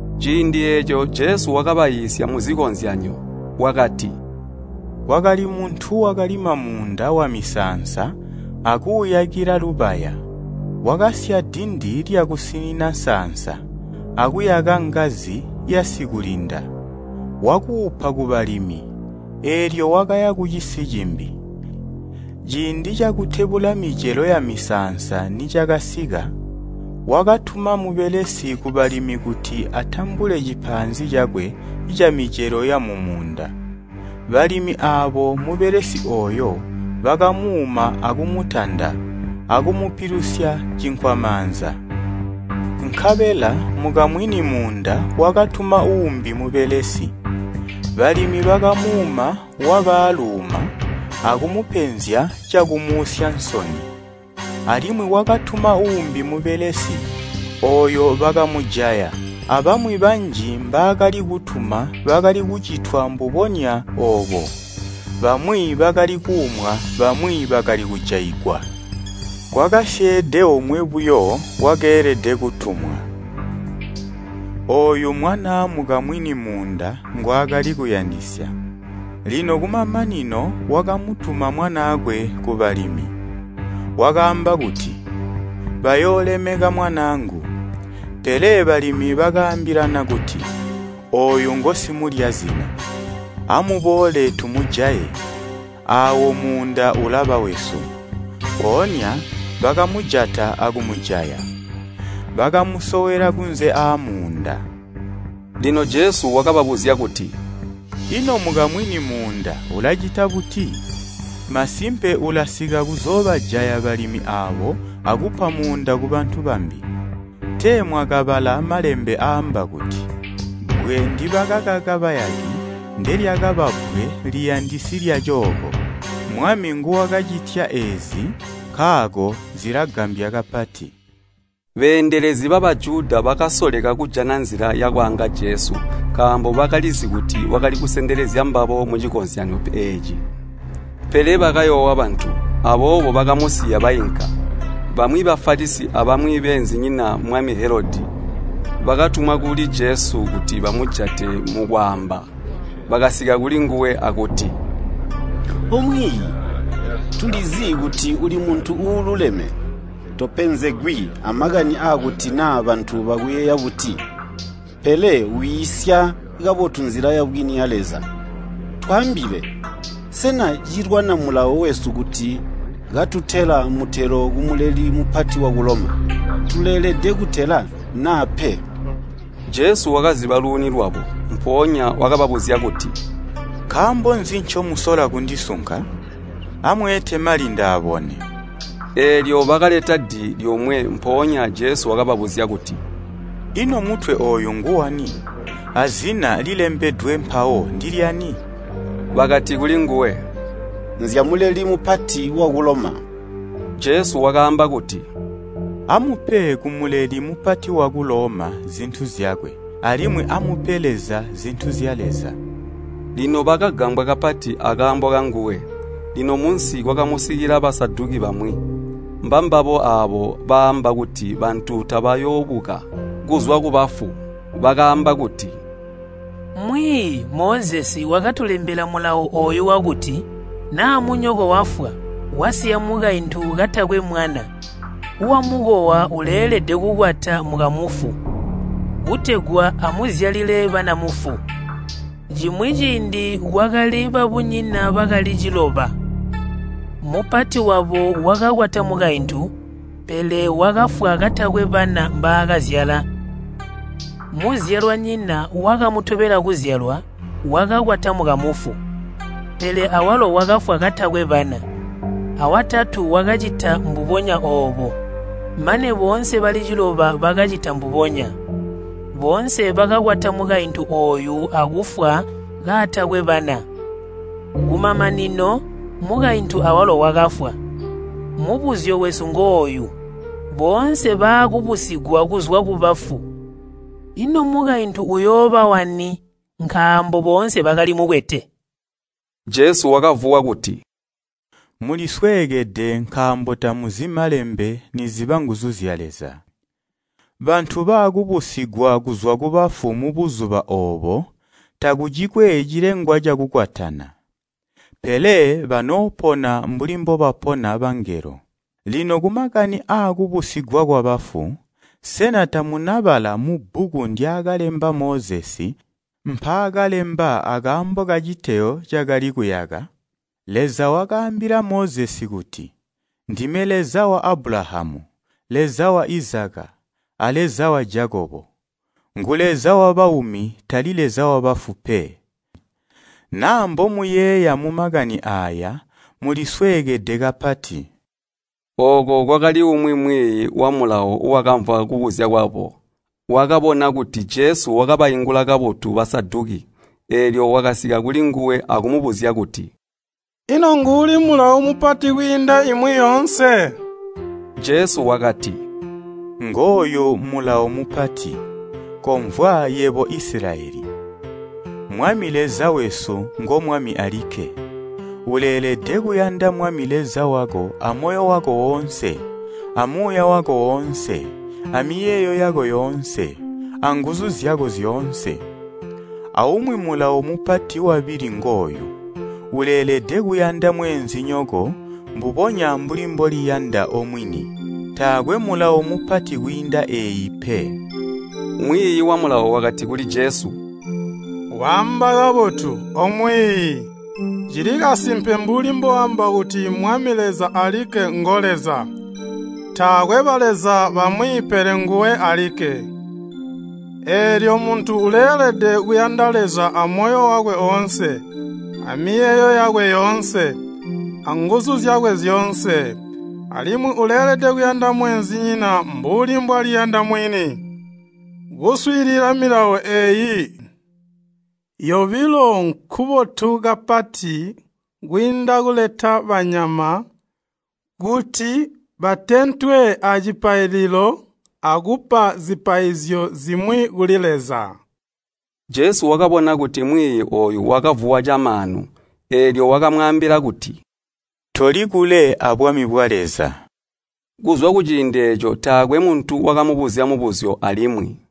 Ciindi eeco Jesu wakabaiisya muzikozyanyo. Wakati, “Kwakali muntu wakalima muunda wamisaansa akuuyakila lubaya, wakasya dindi lyakusinina nsaansa, akuyaka ngazi yasikulinda. Wakuupa kubalimi, eelyo wakaya kucisi cimbi. Ciindi cakutebula micelo yamusaansa nicakasika, wakatuma mubelesi kubalimi kuti atambule cipaanzi cakwe camicelo yamumuunda. Balimi aabo mubelesi ooyo, bakamuuma akumutanda, akumupilusya cinkwamaanza. Nkabela mukamwini muunda wakatuma uumbi mubelesi. Balimi bakamuuma waba aaluuma akumupenzya cakumuusya nsoni. Alimwi wakatuma uumbi mubelesi, ooyo bakamujaya. Abamwi banji mbaakali kutuma bakali kucitwa mbubonya oobo, bamwi bakali kuumwa, bamwi bakali kujaigwa. Kwakasyeede omwe buyo wakeelede kutumwa, ooyu mwanaa mukamwini muunda ngwaakali kuyandisya. Lino kumamanino wakamutuma mwanaakwe kubalimi. Wakaamba kuti, ‘Bayoolemeka mwanaangu!’ Pele balimi bakaambilana kuti, ‘Ooyu ngosimulya zina. Amuboole tumujaye! Aawo muunda ulaba wesu!’ Mpoonya bakamujata akumujaya, bakamusowela kunze aamuunda.” Lino Jesu wakababuzya kuti, “Ino mukamwini muunda ulacita buti? Masimpe ulasika kuzoobajaya balimi aabo akupa muunda kubantu bambi. Tee mwakabala Malembe aamba kuti: ‘Bbwe ndibakaka bayaki, ndelyakaba bbwe liyandisi lyacooko. Mwami nguwakacitya eezi nkaako zilagambya kapati.’” Beendelezi ba Bajuda bakasoleka kujana nzila yakwaanga Jesu nkaambo bakalizi kuti wakali kusendekezya mbabo mucikozyanyo eeci. Pele bakayoowa bantu, aboobo bakamusiya bainka. Bamwi Bafalisi abamwi beenzinyina mwami Helodi bakatumwa kuli Jesu kuti bamujate mukwaamba. Bakasika kuli nguwe akuti, “O Mwiiyi, tulizi kuti uli muntu uululeme. Topenzegwi amakani aakuti naa bantu bakuyeeya buti, pele wiisya kabotu nzila yabwini ya Leza. Twaambile, sena cilwana Mulawo wesu kuti katutela mutelo ku Muleli Mupati waku Loma? Tuleelede kutela, naa pe?” Jesu wakaziba luuni lwabo. Mpoonya wakababuzya kuti, “Nkaambo nzi ncomusola kundisunka? Amweete mali ndaabone.” Eelyo bakaleta di lyomwe, mpoonya Jesu wakababuzya kuti, “Ino mutwe ooyu nguwani, azina lilembedwe mpawo ndilyani?” Bakati kulinguwe, “Nzya Muleli Mupati waku Loma.” Jesu wakaamba kuti, “Amupe ku Muleli Mupati waku Loma zintu zyakwe, alimwi amupe Leza zintu zya Leza.” Lino bakagambwa kapati akaambo kanguwe. Lino munsi kwakamusikila Basaduki bamwi. Mbambabo aabo baamba kuti bantu tabakooyoobuka kuzwa kubafu. Bakaamba kuti, “Mwiiyi, Mozesi wakatulembela mulawo ooyu wakuti, ‘Naa munyoko wafwa, wasiya mukaintu katakwe mwana, wamukowa uleelede kukwata mukamufu, kutegwa amuzyalile bana mufu.’ Cimwi ciindi kwakali babunyina bakali ciloba. Mupati wabo wakakwata mukaintu, pele wakafwa katakwe bana mbaakazyala. Muzyalwanyina wakamutobela kuzyalwa wakakwata mukamufu, pele awalo wakafwa katakwe bana. Awatatu wakacita mbubonya oobo, mane boonse bali ciloba bakacita mbubonya. Boonse bakakwata mukaintu ooyu akufwa kaatakwe bana. Kumamanino, mukaintu awalo wakafwa. Mubuzyo wesu ngooyu, boonse baakubusigwa kuzwa kubafu, ino mukaintu uyooba wani, nkaambo boonse bakali mukwete?” Jesu wakavuwa kuti, “Mulisweekede nkaambo tamuzi Malembe niziba nguzu zya Leza. Bantu baakubusigwa kuzwa kubafu mubuzuba oobo takucikwe cilengwa cakukwatana, pele banoopona mbuli mbobapona bangelo. Lino kumakani aakubusigwa kwabafu, sena tamunabala mubbuku ndyaakalemba Mozesi mpaakalemba akaambo kaciteyo cakali kuyaka? Leza wakaambila Mozesi kuti, ‘Ndime Leza wa Abulahamu, Leza wa Izaka, a Leza wa Jakobo.’ Ngu Leza wabaumi, tali Leza wabafu pe. Naa mbomuyeeya mumakani aaya, mulisweekede kapati.” Ooko kwakali umwi mwiiyi wa Mulawo wakamvwa kubuzya kwabo. Wakabona kuti Jesu wakabaingula kabotu Basaduki, eelyo wakasika kulinguwe akumubuzya kuti, “Ino nguuli mulawo mupati kwiinda imwi yoonse?” Jesu wakati, “Ngooyu mulawo mupati, ‘Komvwa yebo Isilayeli! Mwami Leza wesu ngo Mwami alikke. Uleelede kuyanda Mwami Leza wako amoyo wako oonse, amuuya wako oonse, amiyeeyo yako yoonse, anguzu zyako zyoonse.’ Aumwi mulawo mupati wabili ngooyu, ‘Uleelede kuyanda mweenzinyoko mbubonya mbuli mboliyanda omwini.’ Taakwe mulawo mupati kwiinda eeyi pe.” Mwiiyi wa Mulawo wakati kuli Jesu, “Waamba kabotu, O Mwiiyi, cili kasimpe mbuli mbooamba kuti Mwami Leza alikke ngo Leza, taakwe baleza bamwi pele nguwe alikke. Eelyo muntu uleelede kuyanda Leza amoyo wakwe oonse, amiyeeyo yakwe yoonse, anguzu zyakwe zyoonse, alimwi uleelede kuyanda mweenzinyina mbuli mbwaliyanda mwini. Kuswiilila milawo eeyi yobilo nkubotu kapati kwiinda kuleta banyama kuti batentwe acipaililo akupa zipaizyo zimwi kuli Leza.” Jesu wakabona kuti mwiiyi ooyu wakavuwa camaanu, eelyo wakamwaambila kuti, “Toli kule abwami bwa Leza.” Kuzwa kuciindi eeco taakwe muntu wakamubuzya mubuzyo alimwi.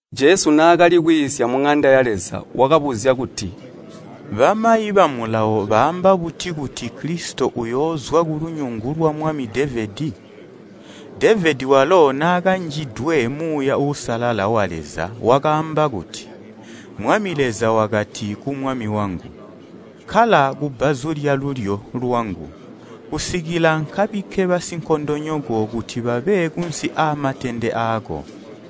Jesu naakali kwiisya muŋanda ya Leza wakabuzya kuti, “Bamayi ba Mulawo baamba buti kuti Kilisito uyoozwa kulunyungu lwamwami Devedi? Devedi walo naakanjidwe Muuya Uusalala wa Leza wakaamba kuti, ‘Mwami Leza wakati ku mwami wangu, kkala kubbazu lyalulyo lwangu, kusikila nkabikke basinkondonyoko kuti babe kunsi aamatende aako.’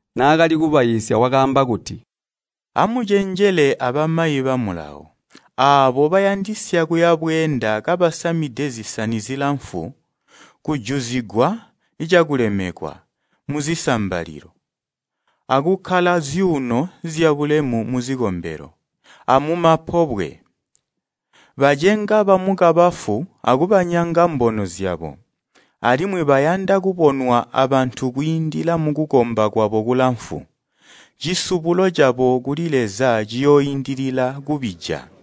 Naakali kubaiisya wakaamba kuti, “Amucenjele abamayi ba Mulawo, aabo bayandisya kuya bweenda kabasamide zisani zilamfu, kujuzigwa cakulemekwa muzisambalilo, akukkala zyuuno zyabulemu muzikombelo, amumapobwe. Bacenga bamukabafu akubanyanga mbono zyabo, alimwi bayanda kubonwa abantu kwiindila mukukomba kwabo kulamfu. Cisubulo cabo kuli Leza ciyooindilila kubija.”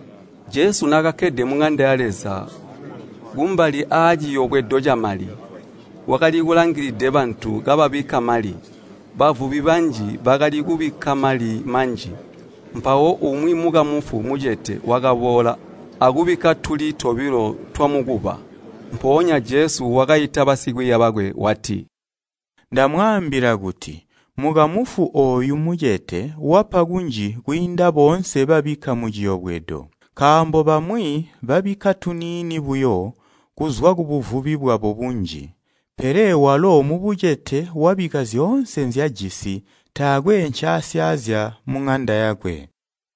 Jesu naakakkede muŋanda ya Leza kumbali aaciyobwedo camali, wakali kulangilide bantu kababikka mali. Bavubi banji bakali kubikka mali manji. Mpawo umwi mukamufu mucete wakaboola akubikka tuli tobilo twamukuba. Mpoonya Jesu wakaita basikwiiya bakwe wati, “Ndamwaambila kuti mukamufu ooyu mucete wapa kunji kwiinda boonse babikka muciyobwedo. Nkaambo bamwi babikka tuniini buyo kuzwa kubuvubi bwabo bunji, pele walo mubucete wabikka zyoonse nzyajisi, taakwe ncaasyaazya muŋanda yakwe.”